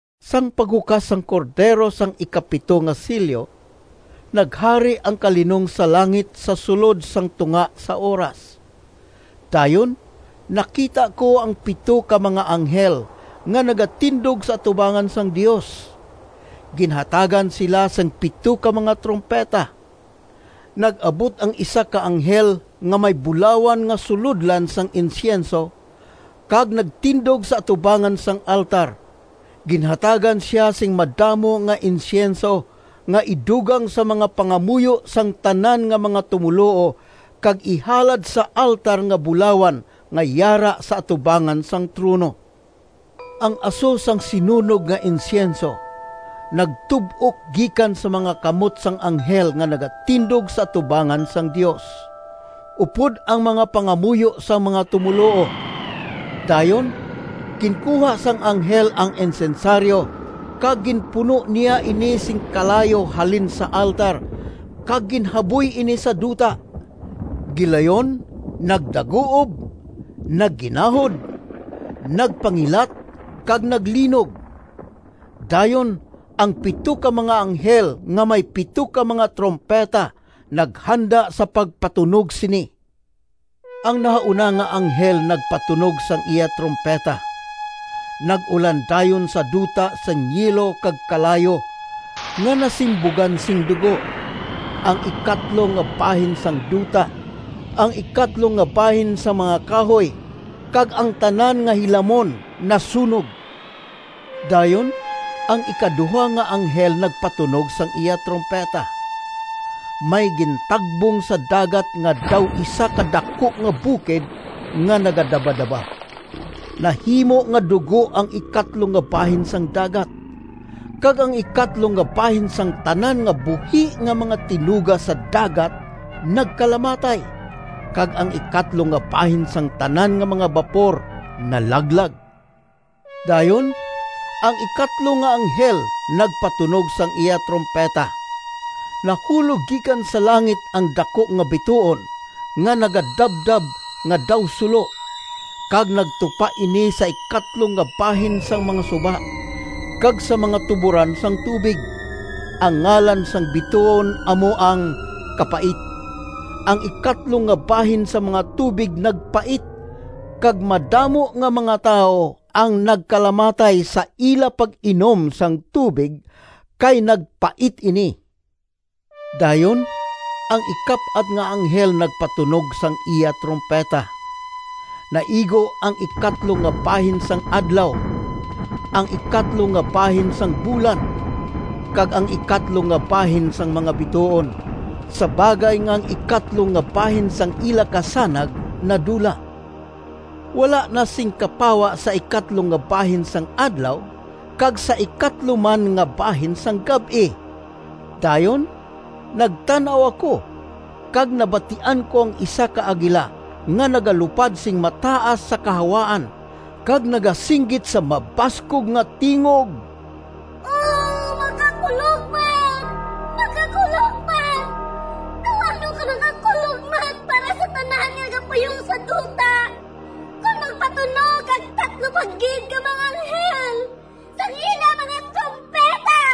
Sang paghukas sang Cordero sang ikapito nga selyo, naghari ang kalinong sa langit sa sulod sang tunga sa oras. Dayon nakita ko ang pito ka mga anghel nga nagatindog sa atubangan sang Dios. Ginhatagan sila sing pito ka mga trumpeta. Nag-abot ang isa ka anghel nga may bulawan nga sulodlan sang insyenso, kag nagtindog sa atubangan sang altar. Ginhatagan sia sing madamo nga insyenso nga idugang sa mga pangamuyo sang tanan nga mga tumoluo kag ihalad sa altar nga bulawan nga yara sa atubangan sang trono. Ang aso sang sinunog nga insyenso nagtub-ok gikan sa mga kamot sang anghel nga nagatindog sa atubangan sang Dios, upod ang mga pangamuyo sang mga tumoluo. Dayon ginkuha sang anghel ang insensaryo, kag ginpuno niya ini sing kalayo halin sa altar kag ginhaboy ini sa duta. Gilayon nagdaguob, nagginahod, nagpangilat, kag naglinog. Dayon ang pito ka mga anghel nga may pito ka mga trumpeta naghanda sa pagpatunog sini. Ang nahauna nga anghel nagpatunog sang iya trumpeta. Nag-ulan dayon sa duta sing yelo kag kalayo nga nasimbugan sing dugo. Ang ikatlo nga bahin sang duta, ang ikatlo nga bahin sang mga kahoy, kag ang tanan nga hilamon nasunog. Dayon ang ikaduha nga anghel nagpatunog sang iya trumpeta. May gintagbong sa dagat nga daw isa ka daku nga bukid nga nagadabadaba. Nahimo nga dugo ang ikatlo nga bahin sang dagat, kag ang ikatlo nga bahin sang tanan nga buhi nga mga tinuga sa dagat nagkalamatay, kag ang ikatlo nga bahin sang tanan nga mga bapor nalaglag. Dayon ang ikatlo nga anghel nagpatunog sang iya trumpeta. Nahulog gikan sa langit ang daku nga bituon nga nagadabdab nga daw sulo, kag nagtupa ini sa ikatlo nga bahin sang mga suba, kag sa mga tuboran sang tubig. (Ang ngalan sang bituon amo ang Kapait.) Ang ikatlo nga bahin sang mga tubig nagpait, kag madamo nga mga tawo ang nagkalamatay sa ila pag-inom sang tubig kay nagpait ini. Dayon ang ikap-at nga anghel nagpatunog sang iya trumpeta. Naigo ang ikatlo nga bahin sang adlaw, ang ikatlo nga bahin sang bulan, kag ang ikatlo nga bahin sang mga bituon, sa bagay nga ang ikatlo nga bahin sang ila kasanag nadula. Wala na sing kapawa sa ikatlo nga bahin sang adlaw kag sa ikatlo man nga bahin sang gab-i. Dayon nagtan-aw ako, kag nabatian ko ang isa ka agila nga nagalupad sing mataas sa kahawaan kag nagasinggit sa mabaskog nga tingog, “O makakulogmat! makakulogmat! Daw ano ka makakulogmat para sa tanan nga nagapuyo sa duta kon magpatunog ang tatlo pa gid ka mga anghel sang ila mga trumpeta!”